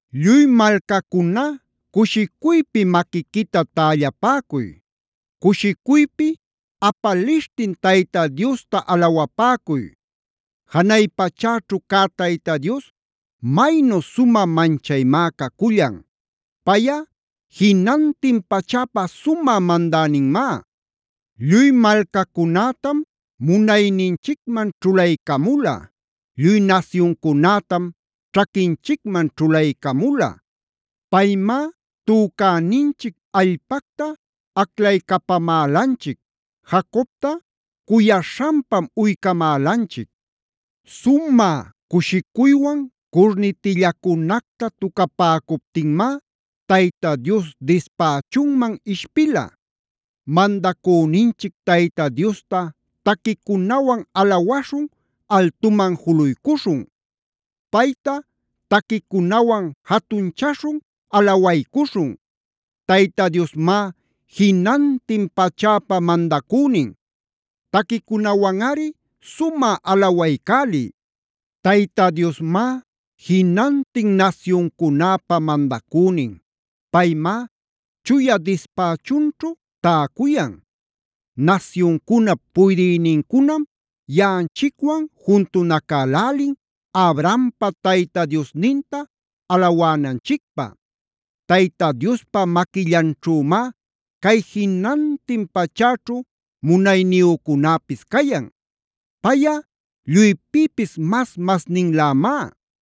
¡Lluy malcacuna cushicuypi maquiquita tällapäcuy! ¡Cushicuypi apalishtin Tayta Diosta alawapäcuy! Janay pachäćhu cä Tayta Dios maynu sumä manchaymá cacullan. Payꞌa jinantin pachäpa sumä mandäninmá. Lluy malcacunätam munayninchicman ćhulaycamula. Lluy nasyuncunätam ćhaquinchicman ćhulaycamula. Paymá tücäninchic allpacta aclaycapamälanchic. Jacobta cuyaśhanpam uycamälanchic. Sumä cushicuywan curnitillacunacta tucapäcuptinmá Tayta Dios dispächunman ishpila. ¡Mandacüninchic Tayta Diosta taquicunawan alawaśhun, altuman juluycuśhun! ¡Payta taquicunawan jatunchaśhun, alawaycuśhun! ¡Tayta Diosmá jinantin pachäpa mandacünin! ¡Taquicunawanꞌari sumä alawaycäliy! Tayta Diosmá jinantin nasyuncunäpa mandacünin. Paymá chuya dispächunćhu täcuyan. Nasyuncunap puydïnincunam yaꞌanchicwan juntunacälälin Abrahampa Tayta Diosninta alawänanchicpä. Tayta Diospa maquillanćhümá cay jinantin pachäćhu munayniyücunäpis cayan. ¡Payꞌa lluypïpis mas-masninlämá!